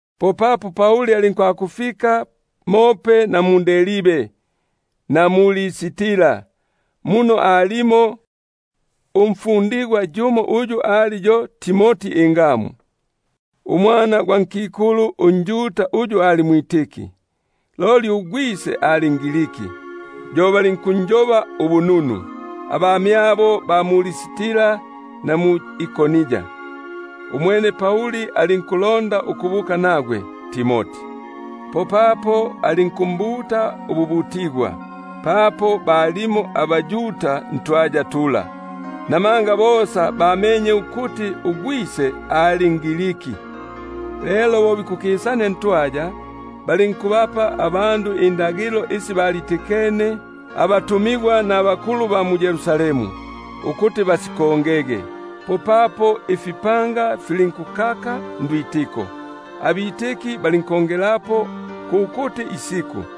Popapo alinkufika mope na mu-Derbe na mu-Listra; mo alimo umfundigwa yumo uyu ali yo Timoti ingamu, umwana gwa nkikulu unjuda uyu ali mwitiki, loli ugwise ali nGriki. Yo balinkunjoba ubununu, abamyabo aba mu-Listra na mwʼIkoni. Umwene Pauli alondaga ukubuka nagwe yuyuyu; popapo alinkumbutako, papo balimo abaYuda ntwaya tula, namanga bosa bamenye ukuti ugwise ali nGriki. Lelo bo bikukisania ntwaya, balinkubapa indagilo isi balitikene abatumigwa nabakulumba ba mu-Yerusalemu, ukuti basikongege. Popapo ifipanga Alinkukaka ndwitiko, Alinkongelapo ukubala amasiku gosa.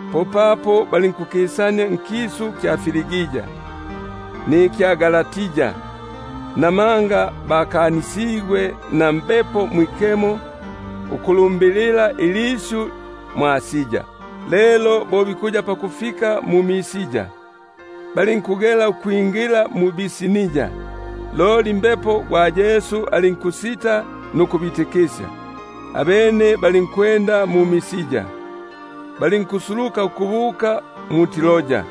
Popapo balinkukisania nkisu kya Frigia na Galatia, namanga bakanisigwe na Mbepo Mwikemo ukulumbilila ilisyu mwʼAsia. Lelo bo bikuya pakufika mu-Misia, balinkugela ukwingila mu-Bitinia, loli Mbepo gwa Yesu alinkusita nuku- bitikisya. Abene balinkukisania mu-Misia, balinkusuluka ukubuka mu-Troa.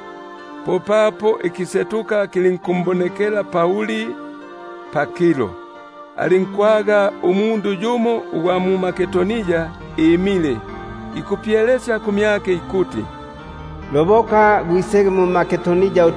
Popapo ikisetuka kilinkumbonekela Pauli pakilo; alinkwaga umundu yumo ugwa mMakedonia imile ikupyelesya kumyake ikuti: Loboka gwisege mMakedonia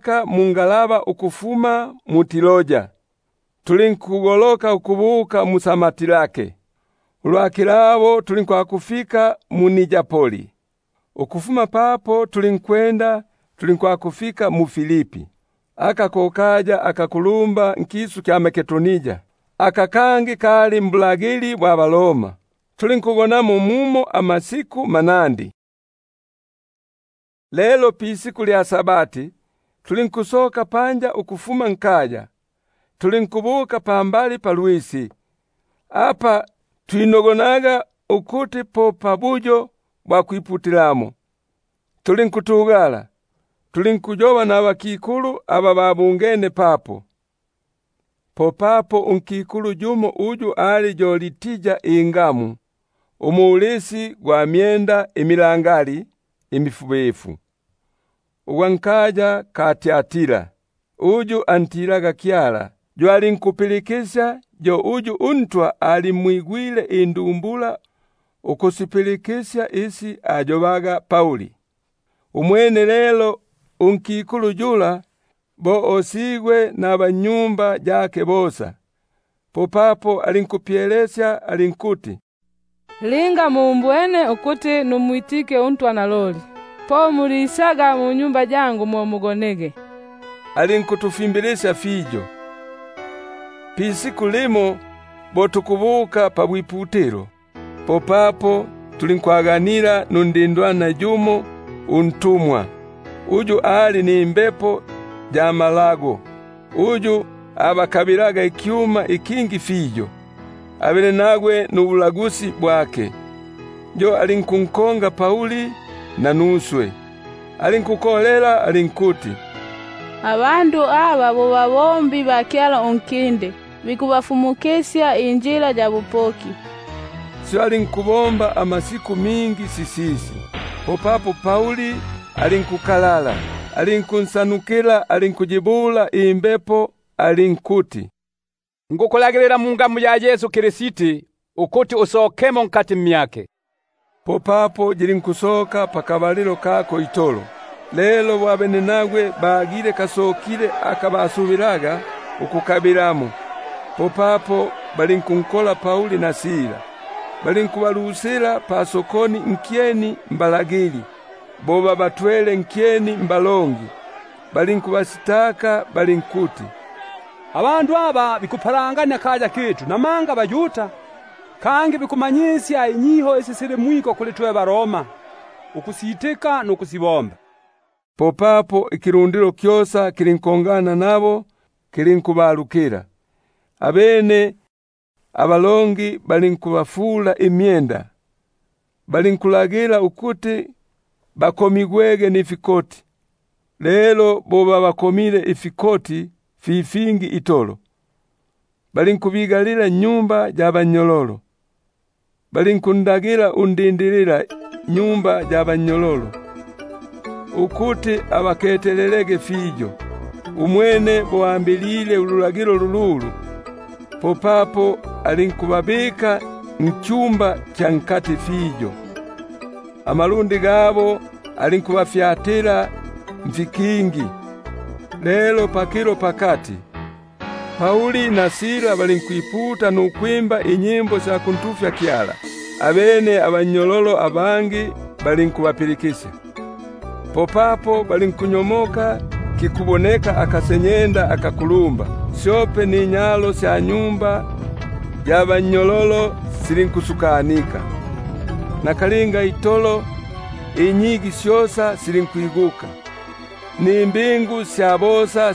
Popapo tulinkwipaka mungalaba ukufuma mu-Troa, tulinkugoloka ukubuka mu-Samotrake; ulwa kilabo tulinkufika mu-Neapoli; ukufuma papo tulinkwakufika mu-Filipi, aka ko kaya akakulumba nkisu kya Makedonia, yo koloni ya baRoma. Tulinkugonamo mumo amasiku manandi. Lelo pisiku lya Sabati, tulinkusoka pakipata, tulinkubuka pambali palwisi, apa twatigi bulipo ubuyo bwa kwiputilapo; tulinku- tugala, tulinkuyoba nabakikulu aba babungene papo. Popapo yumo unkikulu uyu ali yo Lidia ingamu, umulisi gwa myenda imifubifu-ubutitu, ugwa nkaya ka Tiatira, uyu antilaga Kyala, yo alinkupilikisya; yo uNtwa alimwigwile indumbula ukusi- pilikisya isi ayobaga Pauli. Umwene lelo bo osigwe nabannyumba yake bosa, popapo alinkupyelesya alinkuti: Linga mumbwene ukumwitika uNtwa naloli, po mulisaga munyumba yangu mo mugonege; umwene alinkutufimbilisya itolo. Lumo lelo bo nikubuka pabwiputilo, popapo tulinkwaganila nundindwana yumo untumwa, uyu ali nimbepo ya malago, uyu abakabilaga ikyuma ikingi fiyo abenenagwe nubulagusi bwake. Yo alinkunkonga Pauli nanuswe, alinkukolela alinkuti: Abandu aba bo batumwa ba Kyala unkinde, aba bikubafumukisya injila ya bupoki. Syo alinkubomba amasiku mingi sisisi, popapo Pauli alinkukalala, alinkuyisyutukila imbepo, alinkuyibula alinkuti: Nikukulagilila mungamu ya Yesu Kristi, ukuti usokemo mmyake. Popapo yilinkusoka pakabalilo kako itolo. Lelo bo abenenagwe bagile kasokilemo aka basubilaga ukukabilamo, popapo balinkunkola Pauli na Sila balinkubalu- sila pasokoni nkyeni mbalagili; bo babatwele nkyeni mbalongi balinkuti: Abandu aba bikukapalangania akaya kitu, namanga baYuda; kangi bikufumusya inyiho isi sili mwiko kuli twe baRoma, ukusitika nukusibomba. Popapo ikilundilo kyosa kilinkongana nabo kilinkubalukila, abene abalongi balinkubafula imyenda, balinkulagila ukuti bakomigwege nifikoti. Lelo bo babakomile ifikoti fi fingi itolo, balinkubigalila nnyumba ya bannyololo, balinkundagila undindililanyumba ya bannyololo ukuti abaketelelege fiyo. Umwene bo alwambilile ululagilo lululu, popapo alinkubabika nnyumba ya nkati fiyo, amalundi gabo alinkubafyatila mfipindo. Lelo pakilo pakati, Pauli na Sila balinkwiputa nukuntufya Kyala ninyimbo; abene abannyololo balinkubapilikisya. Popapo balinkunyomoka lukuboneka akasenyenda akakulumba, syope ninyalo sya nyumba ya bannyololo silinkusukanika; nakalinga itolo inyigi syosa silinkwiguka, nimbingu sya bosa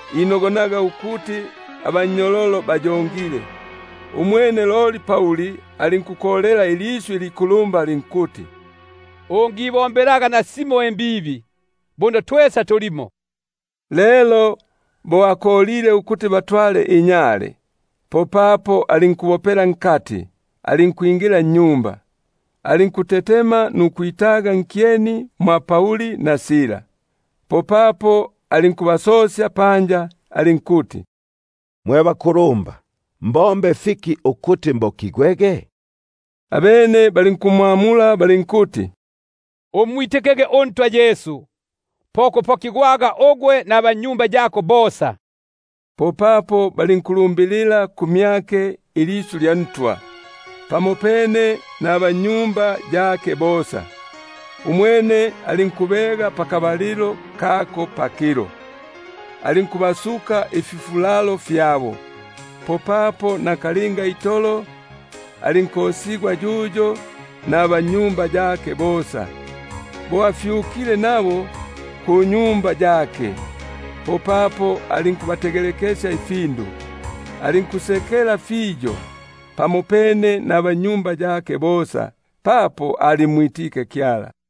inogonaga ukuti abannyololo bayongile. Umwene loli Pauli alinkukolela ilisyu ilikulumba alinkuti: Ungibombelaga nasimo imbibi, buno twesa tulimo. Lelo bo akolile ukuti batwale inyale, popapo alinkunyela alinkwingila nnyumba, alinkutetema nukwitaga nkyeni mwa Pauli na Sila. Popapo alinkubasosya panja alinkuti: Mwe banyafyale, mbombe fiki ukuti mbokigwege? Abene balinkumbula balinkuti: Umwitikege uNtwa Yesu, po kupokigwaga ugwe nabannyumba yako. Popapo balinkumbula ilisyu lya Ntwa pamopene naba- nnyumba yake bosa. Umwene alinkubega pakabalilo kako pakilo, alinkubasuka ififulalo fyabo; popapo nakalinga itolo alinkosigwa yuyo nabannyumba yake bosa. Bo afyukile nabo kunyumba yake, popapo alinkubategelekesya ifindu; alinkusekela fiyo pamopene nabannyumba yake bosa; papo alimwitike Kyala.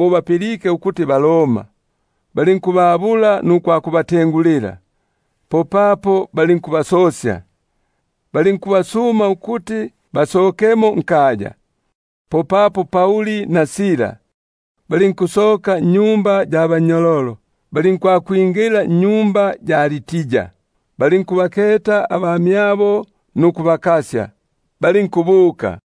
bapilike ukuti baRoma, balinkwisa, balinkubatengulila; popapo balinkubasosya, balinkubasuma ukuti basokemo nkaya. Abene balinkusoka nnyumba ya bannyololo, balinkwakwingila nnyumba ya Lidia, balinkubaketa abamyabo nukubakasya; popapo balinkubuka.